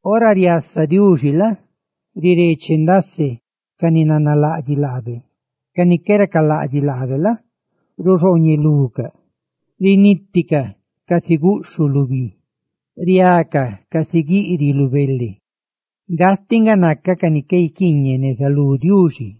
Ora riasa Diuxi la? rireeche ndase ca ni nanalaꞌdxiꞌ laabe; ca ni qué racalaꞌdxiꞌ laabe la? ruxooñelucaꞌ; riniticaꞌ casi guꞌxhuꞌ lu bi, riacaꞌ casi guiꞌriꞌ lu bele; ¡gastiꞌ nga naca ca ni qué guiquiiñeꞌ neza lú Diuxi!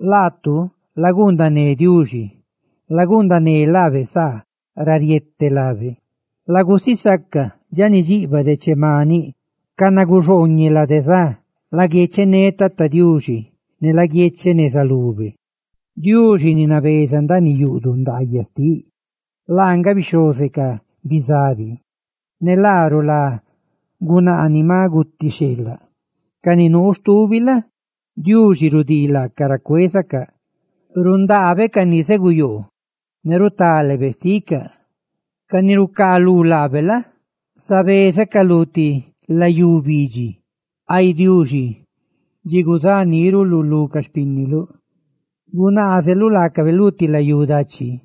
Laatu laguundané Diuxi, laguundané laabe saa ra riete lábe; lagusisaca dxa ni dxiꞌbaꞌ deche maniꞌ canaguxooñeꞌ lade za. ¡Laguiechené Tata Diuxi! ¡Ne laguiecheꞌ neza lube! Diuxi, ni nabeza ndaaniꞌ yuꞌduꞌ ndaayaꞌ xtiꞌ, laa nga bixhooze ca bizabi, ne laa rulá gunaa ni maꞌ guti xheelaꞌ; ca ni nuu stubi la? Diuxi rudii laacaꞌ ra cuézacaꞌ, rundaabe ca ni zeguyoo ne rutálebe xticaꞌ; ca ni rucaalú laabe la? zabézacaꞌ lu ti layú bidxi. Ay Diuxi, dxi guzá níruluꞌ lu ca xpínniluꞌ guzaneluꞌ laacabe lu ti layú dachi,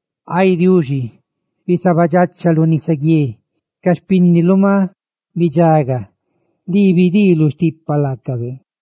Ay Diuxi, bisabadxachaluꞌ nisaguié; ca xpínniluꞌ maꞌ bidxaga, lii bidiiluꞌ stipa laacabe.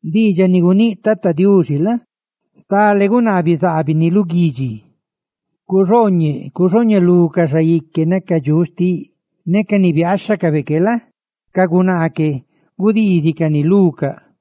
Diidxaꞌ ni guníꞌ Tata Diuxi la? stale gunaa bizaabini lu guidxi: «¡Cuxooñeꞌ, cuxooñelú ca xaique ne ca dxuꞌ xtiꞌ!» Ne ca ni biaaxhacabe que la? ca gunaa que gudiizicani lucaꞌ, ndaaniꞌ lídxicaꞌ,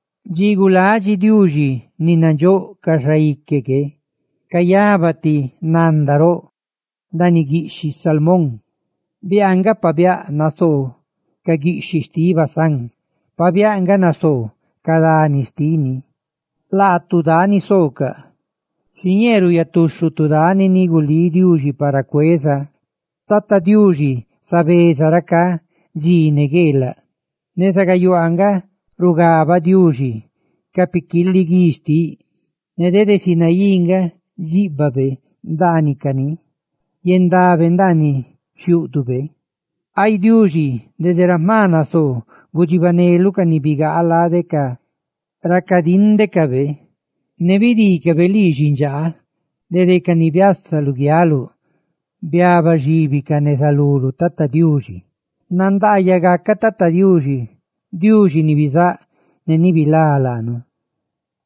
Dxi guladxi Diuxi ni nandxóꞌ ca xaique que, cayaba ti nanda roꞌ ndaaniꞌ guiꞌxhiꞌ Salmón. ¡Biaa nga pabiáꞌ nasoo ca guiꞌxhiꞌ xtiꞌ Basán, ne pabiáꞌ nga nasoo ca dani xtini! Laatu, dani soocaꞌ, xiñee ruuyatuxhutu dani ni gulí Diuxi para cueza. ¡Tata Diuxi zabeza racá dxi ne gueelaꞌ! Neza gayuaa nga rugabaꞌ Diuxi ca piquiiliguí xtiꞌ; ne dede Sinaí nga dxíꞌbabe ndaanicani yendabe ndaaniꞌ xhiúꞌdube. Ay Diuxi, dede ra jma nasoo gudxibaneluꞌ ca ni bigaa lade ra cadíndecabe; ne bidiicabe lii xindxaa lade binni dede ca ni biasa luguialuꞌ biabaxíbicaꞌ neza luluꞌ, Tata Diuxi. ¡Nandaayaꞌ gacaꞌ Tata Diuxi, Diuxi ni bizáꞌ ne ni bilá laanu,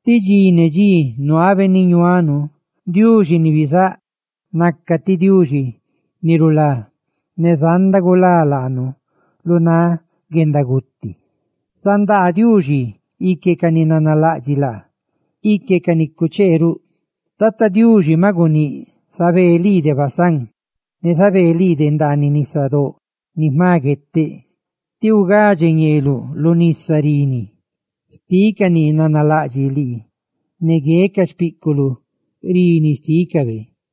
ti dxi ne dxi nuabe ni ñuanu! Diuxi xtinu nga ti Diuxi ni rulá ne zanda gulá laanu lu náꞌ guendaguti. Zandaa Diuxi ique ca ni nanalaꞌdxiꞌ laa, ique ca ni cuchee ruꞌ. Tata Diuxi maꞌ guníꞌ: «Zabeeꞌ lii de Basán; ne zabee lii de ndaaniꞌ nisadóꞌ ni jma gueteꞌ, tí ugadxeluꞌ ñeeluꞌ lu nisa rini xtiꞌ ca ni nanalaꞌdxiꞌ lii, ne gueꞌ ca xpíꞌculuꞌ rini xtícabe.»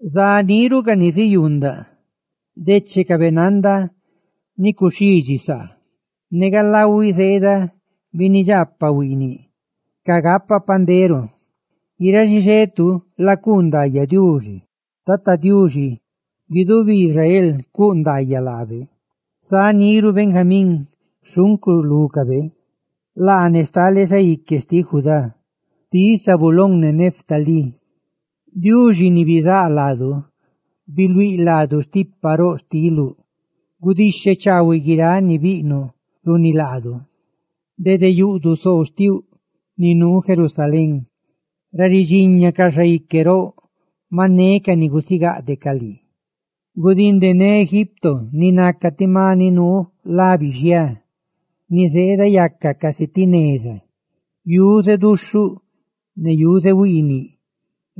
Zaniru ca ni ziyuundaꞌ dechecabe nanda ni cuxhidxi saa, ne galahuiꞌ zeeda binnidxaapaꞌ huiiniꞌ cagapa pandero. ¡Guiráꞌ xixetu lacuu ndaayaꞌ Diuxi, Tata Diuxi! ¡Guidubi Israel lacuu ndaayaꞌ laabe! Zaniru Benjamín xhuncu lúcabe, laa ne stale xaique xtiꞌ Judá, xtiꞌ Zabulón ne Neftalí. Diuxi ni bizáꞌ laadu, biluíꞌ laadu stipa roꞌ xtiluꞌ; ¡gudixhe chaahuiꞌ guiráꞌ ni biꞌnuꞌ runi laadu! Dede yuꞌduꞌ soo xtiuꞌ, ni nuu Jerusalén, ra ridxiña ca xaique roꞌ maꞌ neca ni gusigadeꞌcaꞌ lii, bilidxi Egipto, ni naca ti maniꞌ nabeza lade guixi donda, ni zeedayaca casi ti neza yuze duxhuꞌ ne yuze huiiniꞌ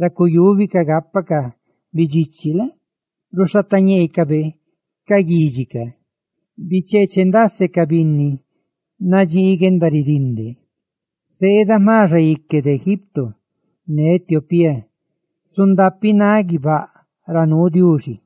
ra cuyúbicaꞌ gápacaꞌ bidxichi la? ruxhateñeecaꞌ ca guidxi; ¡rucheeche ndasecaꞌ ca binni nadxii guendaridinde! Zeeda jma xaique de Egipto; ne Etiopía zundapináꞌ guibáꞌ ra nuu Diuxi.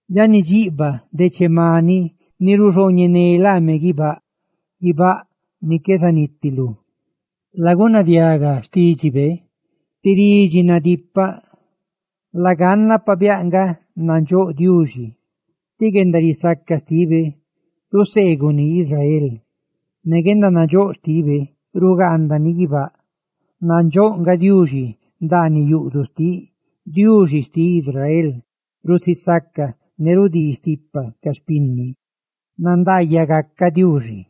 dxa ni dxiꞌbaꞌ deche maniꞌ ni ruxooñené laame guibáꞌ, ca guibáꞌ ni qué zanitilú! Lagunadiaga xtídxibe, ti ridxi nadipaꞌ. Laganna pabiáꞌ nga nandxóꞌ Diuxi: tí guendarisaca xtibe ruseeguni Israel, ne guendanandxóꞌ xtibe rugaandani guibáꞌ nasiá. Nandxóꞌ nga Diuxi ndaaniꞌ yuꞌduꞌ xtiꞌ; Diuxi xtiꞌ Israel rusisaca ne rudii stipa ca xpinni. ¡Nandaayaꞌ gacaꞌ Diuxi!